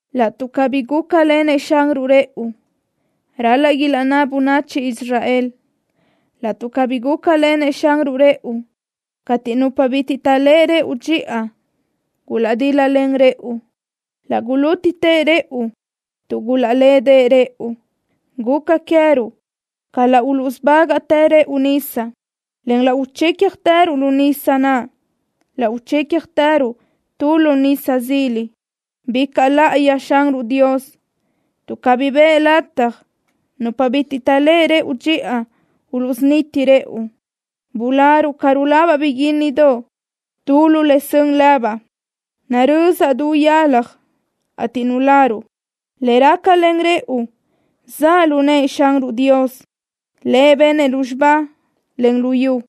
“Laʼtuʼ cabí gúcalenëʼ Xanruʼ rëʼu”, ral-laʼ ilaʼnná bönachi Israel: “Laʼtuʼ cabí gúcalenëʼ Xanruʼ rëʼu cateʼ nupa bitiʼ taʼléʼe rëʼu dxiʼa gulaʼdíl-lalen rëʼu, laʼ gulútitë rëʼu tuʼ gulaʼlédeʼe rëʼu. Guca queë́ruʼ ca laʼ usubágaʼtë rëʼu nisa, en laʼ uchícjatëruʼ lu nisa naʼ. Laʼ uchícjatëruʼ tu lu nisa zila.” ¡Bicaʼ láʼayi Xanruʼ Dios tuʼ cabí biʼë lataj nupa bitiʼ taʼléʼe rëʼu dxiʼa uluʼsuniti rëʼu! Bularuʼ ca rulabaʼ biguínnidoʼ tu lu le zön lëbaʼ. Narözaʼ du yalaj, ateʼ nuláruʼ. Le rácalen rëʼu zaʼ lu nëʼë Xanruʼ Dios. Lëʼ benëʼ lúzxiba, en lu yu.